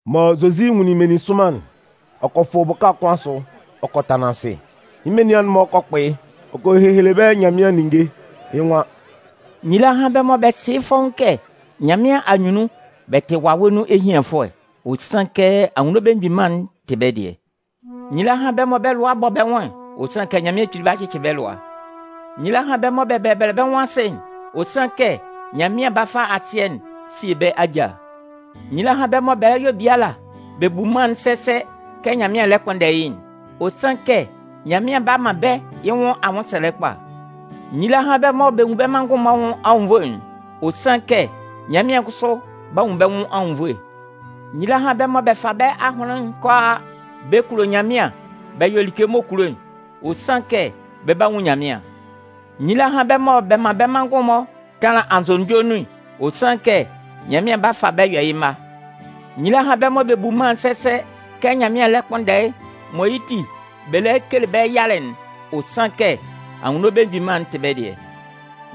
Mɔ Zozi nwunlin meninsʋnman'n, ɔ kɔ fʋ bʋka kʋn asʋ, ɔ kɔ tanlan asɩ. Yɩ́ menian'n-mɔ kɔ kpʋ yɩ́, ɔ kɔ hehele bɛ́ Nyanmɩan ninnge. Yɩ́ nwan: “Nyila hán bɛ́ mɔ bɛ sɩ yɩ́ fɔ́ʋ́n kɛ Nyanmɩan anyunnun bɛ tɩ wawɛ nun ehianfʋɛ'n. Ɔ sanlɩn kɛ Anwunno Belemgbin Mân'n tɩ bɛ́ dɩɛ. “Nyila hán bɛ́ mɔ bɛ́ lʋa a bɔ bɛ́ nwʋn'n. Ɔ sanlɩn kɛ Nyanmɩan 'ba cɩcɩ bɛ́ lʋa. “Nyila hán bɛ́ mɔ bɛ bɛbɛlɛ bɛ́ nwʋn asɩ'n. Ɔ sanlɩn kɛ Nyanmɩan 'ba fa asɩɛ'n sie bɛ́ ajâ. “Nyila hán bɛ́ mɔ bɛ yɔ biala bɛ bu mân'n sɛsɛ kɛ Nyanmɩan lɛ kpʋnndɛ yɩ́'n. Ɔ sanlɩn kɛ Nyanmɩan 'ba man bɛ́ yɩ́ nwʋn anwʋnsɛlɛ kpa. “Nyila hán bɛ́ mɔ bɛ nwun bɛ́ manngʋn'n-mɔ anwʋn anwunnvoe'n. Ɔ sanlɩn kɛ Nyanmɩan kʋsʋ 'ba nwun bɛ́ nwʋn anwunnvoe. “Nyila hán bɛ́ mɔ bɛ fa bɛ́ ahʋnlɩn'n kʋalaa bɛ kulo Nyanmɩan bɛ yɔ like m'ɔ kulo'n. Ɔ sanlɩn kɛ bɛ 'ba nwun Nyanmɩan. “Nyila hán bɛ́ mɔ bɛ man bɛ́ manngʋn-mɔ tanlan anzʋnunjɔ nun'n. Ɔ sanlɩn kɛ Nyanmɩan 'ba fa bɛ́ yɔ yɩ́ mma. “Nyila hán bɛ́ mɔ bɛ bu mân'n sɛsɛ kɛ Nyanmɩan lɛ kpʋnndɛ'n mɔ yɩ́ ti bɛ lɛ kele bɛ́ yalɛ'n. Ɔ sanlɩn kɛ Anwunno Belemgbin Mân'n tɩ bɛ́ dɩɛ.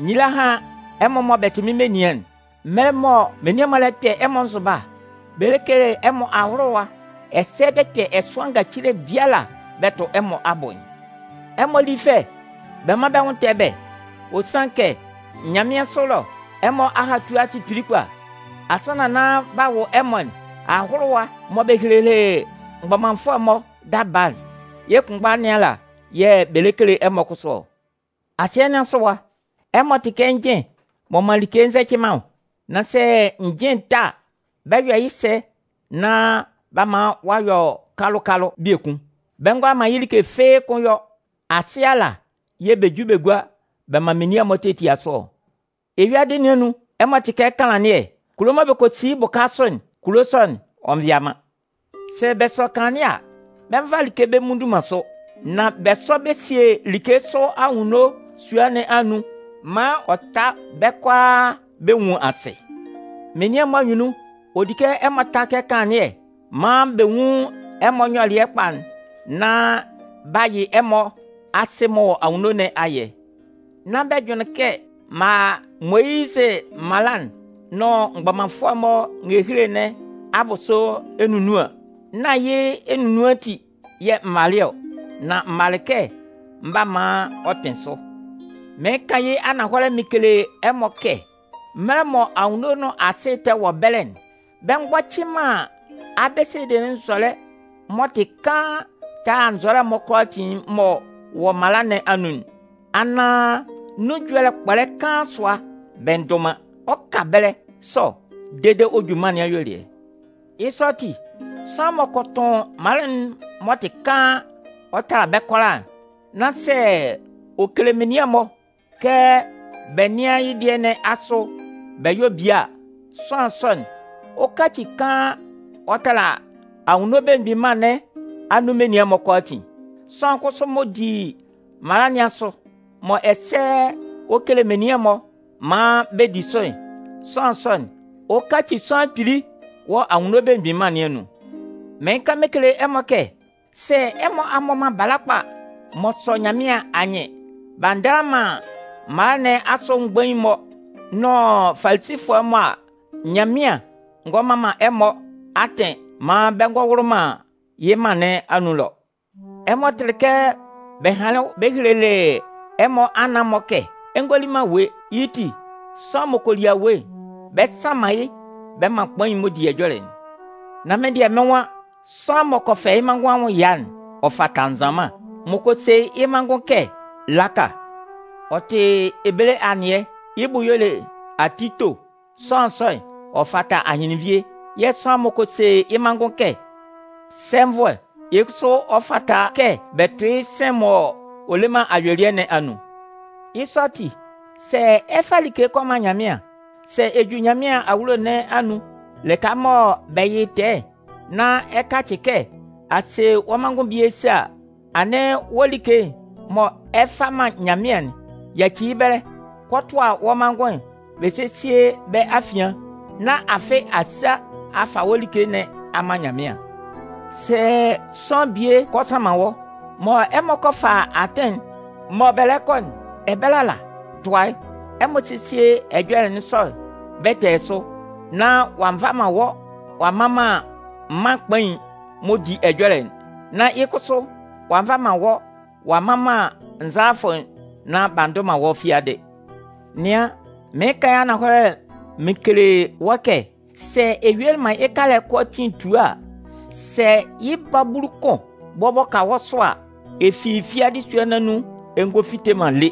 “Nyila hán ɛmɔ mɔ bɛ tɩ mɩ́n menian'n. Mɛlɛ mɔ menian'n-mɔ 'kpɛ ɛmɔ nzʋba, bɛ kele ɛmɔ ahʋlʋwa ɛsɛ bɛ kpɛ ɛsʋan ngacile biala bɛ tʋ ɛmɔ abʋ'n, ɛmɔ lí fɛ, bɛ mán bɛ́ nwʋn tɛ́ bɛ́! Ɔ sanlɩn kɛ nyanmɩansʋ ɛlɔ, ɛmɔ ahatua'n tɩ kpili kpa. Asannan nán b'a wʋ ɛmɔ'n, ahʋlʋwa'n mɔ bɛ helelɩ mgbɔmanfʋɛ'n-mɔ daba'n, yɩ́ kʋnmgba nɩn ala yɛ̂ bɛ 'kele ɛmɔ kʋsʋ ɔ. “Asɩɛ nɩn asʋ ɛwa, ɛmɔ tɩ kɛ njɩn m'ɔ man like nzɛcɩ man ɔ. Nan sɛ njɩn'n ta a, bɛ 'yɔ sɛ nán b'a man ɔ'a yɔ kalʋ-kalʋ biekun? Bɛ ngʋala man yɩ́ like fɩ́ɩ́ kʋ́n yɔ. Asɩ ala yɛ̂ bɛ ju bɛ gua bɛ man menian'n-mɔ tetia sʋ ɔ. “Eyuadɩ nɩn anun, ɛmɔ tɩ kɛ kanlannɩɛ. Kulo mɔ bɛ kɔ si yɩ́ bʋka sʋ'n, kulo sɔ'n, ɔ nvɩa man. Sɛ bɛ sɔ kanlannɩɛ a, bɛ nva man like bɛ mmutu man sʋ. Nan bɛ sɔ bɛ sie like sʋ anwunno sua nɩn anun maan ɔ ta bɛ́ kʋalaa bɛ nwun asɩ. Menian'n-mɔ anyunnun, ɔ di kɛ ɛmɔ ta kɛ kanlannɩɛ maan bɛ nwun ɛmɔ nyɔlɩɛ kpa'n nán b'a yɩ ɛmɔ Asɩ m'ɔ wɔ anwunno nɩn ayɛ. “Nán bɛ jʋnlɩn kɛ m'an a Moyizɩ mala'n nʋn mgbɔmanfʋɛ'n-mɔ ngehele nɩn abʋsʋ enunnuan. Nán yɩ́ enunnuan ati yɛ̂ m malɩ ɔ. Nan m malɩ kɛ mɩn 'ba maan ɔ kpɩn sʋ. Mɩɩn kan yɩ́ ananhɔlɛ mɩn kele ɛmɔ kɛ mɛlɛ mɔ anwunno nʋn asɩ tɛ wɔ ɛbɛlɛ'n, bɛ mgbɔcɩ man abesede nzɔlɛ'n m'ɔ tɩ kaan tala nzɔlɛ'n-mɔ kʋalaatin m'ɔ wɔ mala nɩn anun'n, anaan nun ɛjɔlɛ kpɔlɛ kaan sʋa bɛ ndʋ man. Ɔ 'ka ɛbɛlɛ sɔ dede ɔ kɔ ju mân nɩn ayuelɩɛ. Yɩ́ sɔ ati, sʋanlan m'ɔ kɔ tʋn mala'n nunhan m'ɔ tɩ kaan ɔ tala bɛ́ kʋalaa'n, nán sɛ ɔ kele menian'n-mɔ kɛ bɛ nɩ́an yɩ́ dɩɛ nɩn asʋ bɛ yɔ́ bie a, sʋanlan sɔ'n, ɔ 'kaci kaan ɔ tala Anwunno Belemgbin Mân nɩn anun menian'n-mɔ kʋalaatin. Sʋanlan kʋsʋ m'ɔ di mala nɩn asʋ, mɔ ɛsɛ ɔ kele menian'n-mɔ maan bɛ di sʋ'n, sʋanlan sɔ'n, ɔ 'kaci sʋanlan kpili wɔ Anwunno Belemgbin Mân nɩn anun. Mɩɩn kan mɩn kele ɛmɔ kɛ, sɛ ɛmɔ a mmɔ man bala kpa m'ɔ sɔ Nyanmɩan anyɩn b'a ndala man mala nɩn asʋ mgbain'n-mɔ nʋn Falisifʋɛ'n-mɔ a, Nyanmɩan ngɔ man man ɛmɔ atɩn maan bɛ ngɔ wʋlʋ man yɩ́ mân nɩn anun ɛlɔ. “Ɛmɔ tɩlɩ kɛ bɛ hanlɩn bɛ helelɩ ɛmɔ anan-mɔ kɛ: Ɛ ngɔ li man awue, yɩ́ ti, sʋanlan m'ɔ kɔ li awue'n, bɛ sánman yɩ́ bɛ mán kpain'n m'ɔ di ɛjɔlɛ'n. Nan mɩ́n dɩɛ, mɩ́n nwan: Sʋanlan m'ɔ kɔ fɛ yɩ́ manngʋn anwʋn ɛya'n, ɔ fata nzanman. M'ɔ kɔ se yɩ́ manngʋn kɛ: ‘Laka!’ (Ɔ tɩ ebele anɩɛ, yɩ́ bʋ y'ɔ le ‘ati to’), sʋanlan sɔ'n, ɔ fata ahɩnlɩnnvie. Yɛ̂ sʋanlan m'ɔ kɔ se yɩ́ manngʋn kɛ: ‘Sɛnvʋɛ!’, yɩ́ kʋsʋ ɔ fata kɛ bɛ tʋ yɩ́ sɩ̂n'n m'ɔ le man ayuelɩɛ nɩn anun. “Yɩ́ sɔ ati, sɛ ɛ 'fa like kɔ man Nyanmɩan, sɛ ɛ ju Nyanmɩan awulo nɩn anun lɩka mɔ bɛ yɩ tɛɛ'n nán ɛ kacɩ kɛ a se wɔ́ manngʋn bie sa a, anɩn wɔ́ like'n mɔ ɛ 'fa man Nyanmɩan'n, yaci yɩ́ ɛbɛlɛ, kɔ tʋa wɔ́ manngʋn'n bɛ sésie bɛ́ afian, nán afɩ a sa a fa wɔ́ like nɩn a man Nyanmɩan. “Sɛ sʋanlan bie kɔ sanman wɔ́, mɔ ɛmɔ kɔ fa atɩn'n mɔ bɛ lɛ kɔ'n, ɛbɛlɛ ala, tʋa yɩ́, ɛmɔ sésie ɛjɔlɛ sɔ'n bɛtɛɛ sʋ, nán ɔ'a nva man wɔ́ ɔ'a mman man kpain'n m'ɔ di ɛjɔlɛ'n, nán yɩ́ kʋsʋ ɔ'a nva man wɔ́ ɔ'a mman man nzalafʋ'n, nán b'a ndʋ man wɔ́ fiadɩ. Nɩan, mɩɩn kan yɩ́ ananhɔlɛ mɩn kele wɔ́ kɛ sɛ ɛ yuelɩ man yɩ́ kalɛ'n kʋalaatin tua a, sɛ yɩ́ babulu kʋn bɔbɔ ka wɔ́ sʋ a, ɛ fi fiadɩ sua nɩn anun ɛ ngɔ fite man lé.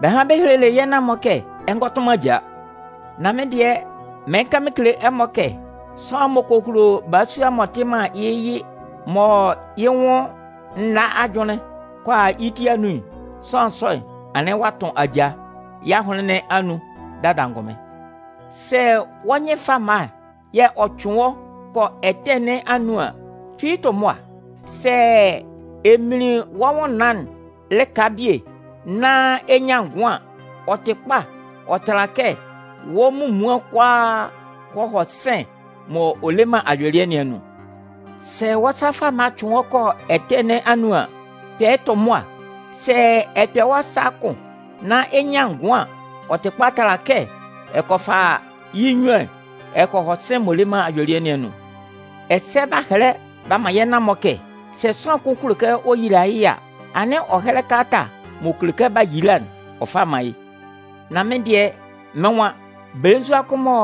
“Bɛ hanlɩn bɛ helelɩ yɛ́ nan-mɔ kɛ: Ɛ ngɔ tʋn man ajaa. Nan mɩ́n dɩɛ, mɩɩn kan mɩn kele ɛmɔ kɛ sʋanlan m'ɔ kɔ hulo balasua m'ɔ tɩ man yɩ́ yɩ mɔ yɩ́ nwʋn nna ajʋnlɩn kɔ a yɩ́ ti anun'n, sʋanlan sɔ'n, anɩn ɔ'a tʋn ajaa yɩ́ ahʋnlɩn nɩn anun dada angʋnmɩn. Sɛ wɔ́ nyɩn fama'n yɛ̂ ɔ cʋɩn wɔ́ kɔ ɛtɛ nɩn anun an, tu yɩ́ tʋ mʋa. Sɛ ɛ minlin wɔ́ nwʋnnaan'n lɩka bie nán ɛ nyan ngʋan an, ɔ tɩ kpa ɔ tala kɛ wɔ́ munmuan'n kʋalaa kɔ hɔ sɩ̂n'n m'ɔ le man ayuelɩɛ nɩn anun. Sɛ wɔ́ sa fama'n yɛ̂ ɔ cʋɩn wɔ́ kɔ ɛtɛ nɩn anun an, kpɛ tʋ mʋa. Sɛ ɛ kpɛ wɔ́ sa'n kʋn nán ɛ nyan ngʋan an, ɔ tɩ kpa ɔ tala kɛ ɛ kɔ fa yɩ́ nnyuan'n ɛ kɔ hɔ sɩ̂n'n m'ɔ le man ayuelɩɛ nɩn anun. “Ɛsɛ bɛ hanlɩn bɛ helelɩ yɛ́ nan-mɔ kɛ: Sɛ sʋanlan kʋn kulo kɛ ɔ yila yɩ́ yɩ a, anɩn ɔ hɛ́lɛ kalata m'ɔ kele kɛ b'a yila'n ɔ fá mán yɩ́. Nan mɩ́n dɩɛ, mɩ́n nwan: Belenzua kʋn mɔ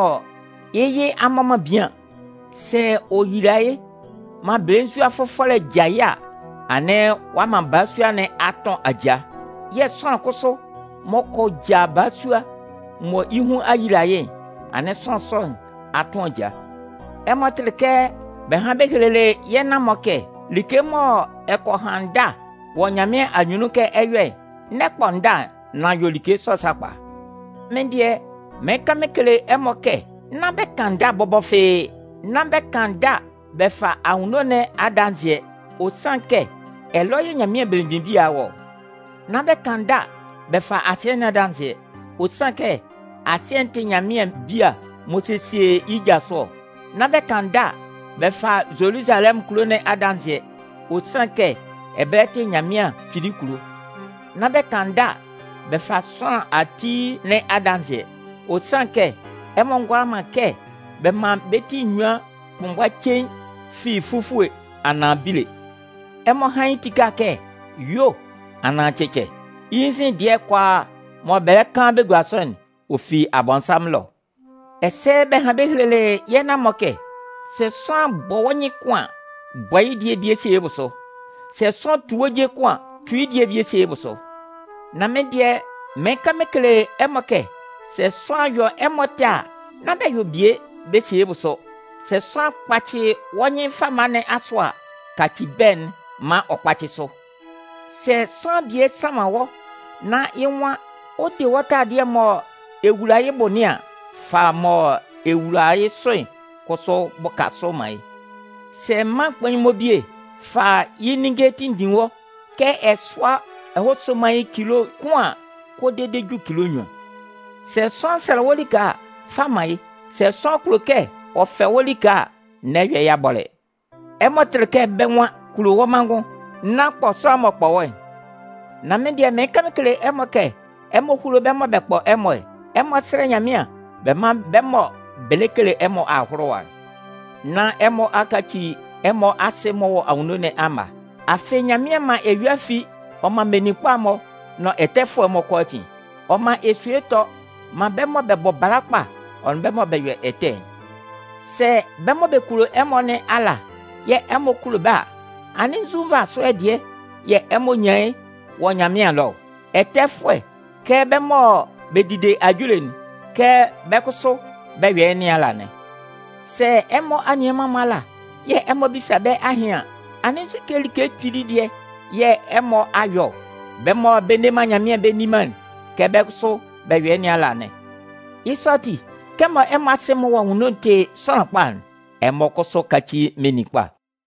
yɩ́ yɩ a mmɔ man bian, sɛ ɔ yila yɩ́ maan belenzua fʋfɔlɛ ja yɩ́ a, anɩn ɔ'a man balasua nɩn a tʋn ajaa. Yɛ̂ sʋanlan kʋsʋ m'ɔ kɔ ja balasua mɔ yɩ́ hun a yila yɩ́'n, anɩn sʋanlan sɔ nɩn a tʋn ajaa. “Ɛmɔ tɩlɩ kɛ bɛ hanlɩn bɛ helelɩ yɛ́ nan-mɔ kɛ: Like mɔ ɛ kɔ han ndâ wɔ Nyanmɩan anyunnun kɛ ɛ 'yɔ'n, n'ɛ kpɔ ndâ'n, nan yɔ like sɔ'n sakpa. Mɩ́n dɩɛ, mɩɩn kan mɩn kele ɛmɔ kɛ nán bɛ kan ndâ bɔbɔ fɩ́ɩ́. Nán bɛ kan ndâ bɛ fa anwunno nɩn adanzɩɛ, ɔ sanlɩn kɛ ɛlɔ yɛ̂ Nyanmɩan belemgbin bia'n wɔ ɔ. Nán bɛ kan ndâ bɛ fa asɩɛ nɩn adanzɩɛ, ɔ sanlɩn kɛ asɩɛ'n tɩ Nyanmɩan bia m'ɔ sesie yɩ́ ja sʋ ɔ. Nán bɛ kan ndâ bɛ fa Zoluzalɛmʋn kulo nɩn adanzɩɛ, ɔ sanlɩn kɛ ɛbɛlɛ tɩ Nannan Nyanmɩan Kpili kulo. Nán bɛ kan ndâ bɛ fa sʋanlan ati nɩn adanzɩɛ, ɔ sanlɩn kɛ ɛmɔ ngʋala man kɛ bɛ man bɛ́ ti enyuan kʋnmgba cein fi fufue anaan bile. Ɛmɔ hán yɩ́ tika kɛ: ‘Yuo’ anaan ‘Cɛcɛ.’ Yɩ́ nzin dɩɛ'n kʋalaa mɔ bɛ kan bɛ gua sʋ'n, ɔ fi Abɔnsanmʋn ɛlɔ. “Ɛsɛ bɛ hanlɩn bɛ helelɩ yɛ́ nan-mɔ kɛ: Sɛ sʋanlan bɔ wɔ́ nyɩn kʋn an, bɔ yɩ́ dɩɛ'n bie sie yɩ́ bʋsʋ. Sɛ sʋanlan tu wɔ́ je kʋn an, tu yɩ́ dɩɛ'n bie sie yɩ́ bʋsʋ. Nan mɩ́n dɩɛ, mɩɩn kan mɩn kele ɛmɔ kɛ sɛ sʋanlan yɔ ɛmɔ ɛtɛ a, nán bɛ yɔ bie bɛ sie yɩ́ bʋsʋ. Sɛ sʋanlan kpacɩ wɔ́ nyɩn fama nɩn asʋ a, kaci bɛ̂'n maan ɔ kpácɩ sʋ. Sɛ sʋanlan bie sanman wɔ́ nán yɩ́ nwan ɔ 'de wɔ́ taladɩɛ'n mɔ ɛ wula yɩ́ bʋ nɩn an, fa mɔ ɛ wula yɩ́ sʋ'n kʋsʋ bʋka sʋ man yɩ́. Sɛ mân mgbain'n-mɔ bie fa yɩ́ ninnge tinndin wɔ́ kɛ ɛ sʋ́a ɛ hɔ́ sóman yɩ́ atɩn cilo kʋn an, kɔ dede ju cilo nnyuan. Sʋanlan sɛlɛ wɔ́ like a, fa man yɩ́. Sɛ sʋanlan kulo kɛ ɔ fɛ wɔ́ like a, n'ɛ yɔ yɩ́ abɔlɛ. “Ɛmɔ tɩlɩ kɛ bɛ́ nwan: Kulo wɔ́ manngʋn, nán kpɔ sʋanlan m'ɔ kpɔ wɔ́'n. Nan mɩ́n dɩɛ mɩɩn kan mɩn kele ɛmɔ kɛ ɛmɔ húlo bɛ́ mɔ bɛ kpɔ ɛmɔ'n. Ɛmɔ sɛ́lɛ Nyanmɩan bɛ mán bɛ́ mɔ bɛ kele ɛmɔ ahʋlʋwa'n, nán ɛmɔ a kaci ɛmɔ Asɩ'n m'ɔ wɔ anwunno nɩn amma. Afɩ Nyanmɩan man eyua'n fi ɔ man meninkpa'n-mɔ nʋn ɛtɛfʋɛ'n-mɔ kʋalaatin. Ɔ man esue'n tɔ ɔ man bɛ́ mɔ bɛ bɔ bala kpa ɔ nʋn bɛ́ mɔ bɛ yɔ ɛtɛ'n. Sɛ bɛ́ mɔ bɛ kulo ɛmɔ nɩn ala yɛ̂ ɛmɔ kulo bɛ́ a, anɩn nzu nvasʋɛ dɩɛ yɛ̂ ɛmɔ nyan yɩ́ wɔ Nyanmɩan ɛlɔ ɔ? Ɛtɛfʋɛ kɛ bɛ́ mɔ bɛ dide ajule'n, kɛ bɛ́ kʋsʋ bɛ yɔ yɩ́ nɩn ala anɩn. Sɛ ɛmɔ anianman'n-mɔ ala yɛ̂ ɛmɔ bisa bɛ́ ahɩn an, anɩn nzu like kpili dɩɛ yɛ̂ ɛmɔ a yɔ ɔ? Bɛ́ mɔ bɛ nne man Nyanmɩan bɛ nni man'n, kɛ bɛ́ kʋsʋ bɛ yɔ yɩ́ nɩn ala anɩn. Yɩ́ sɔ ati, kɛmɔ ɛmɔ Asɩ m'ɔ wɔ anwunno'n tɩ sʋanlan kpa'n, ɛmɔ kʋsʋ káci meninkpa.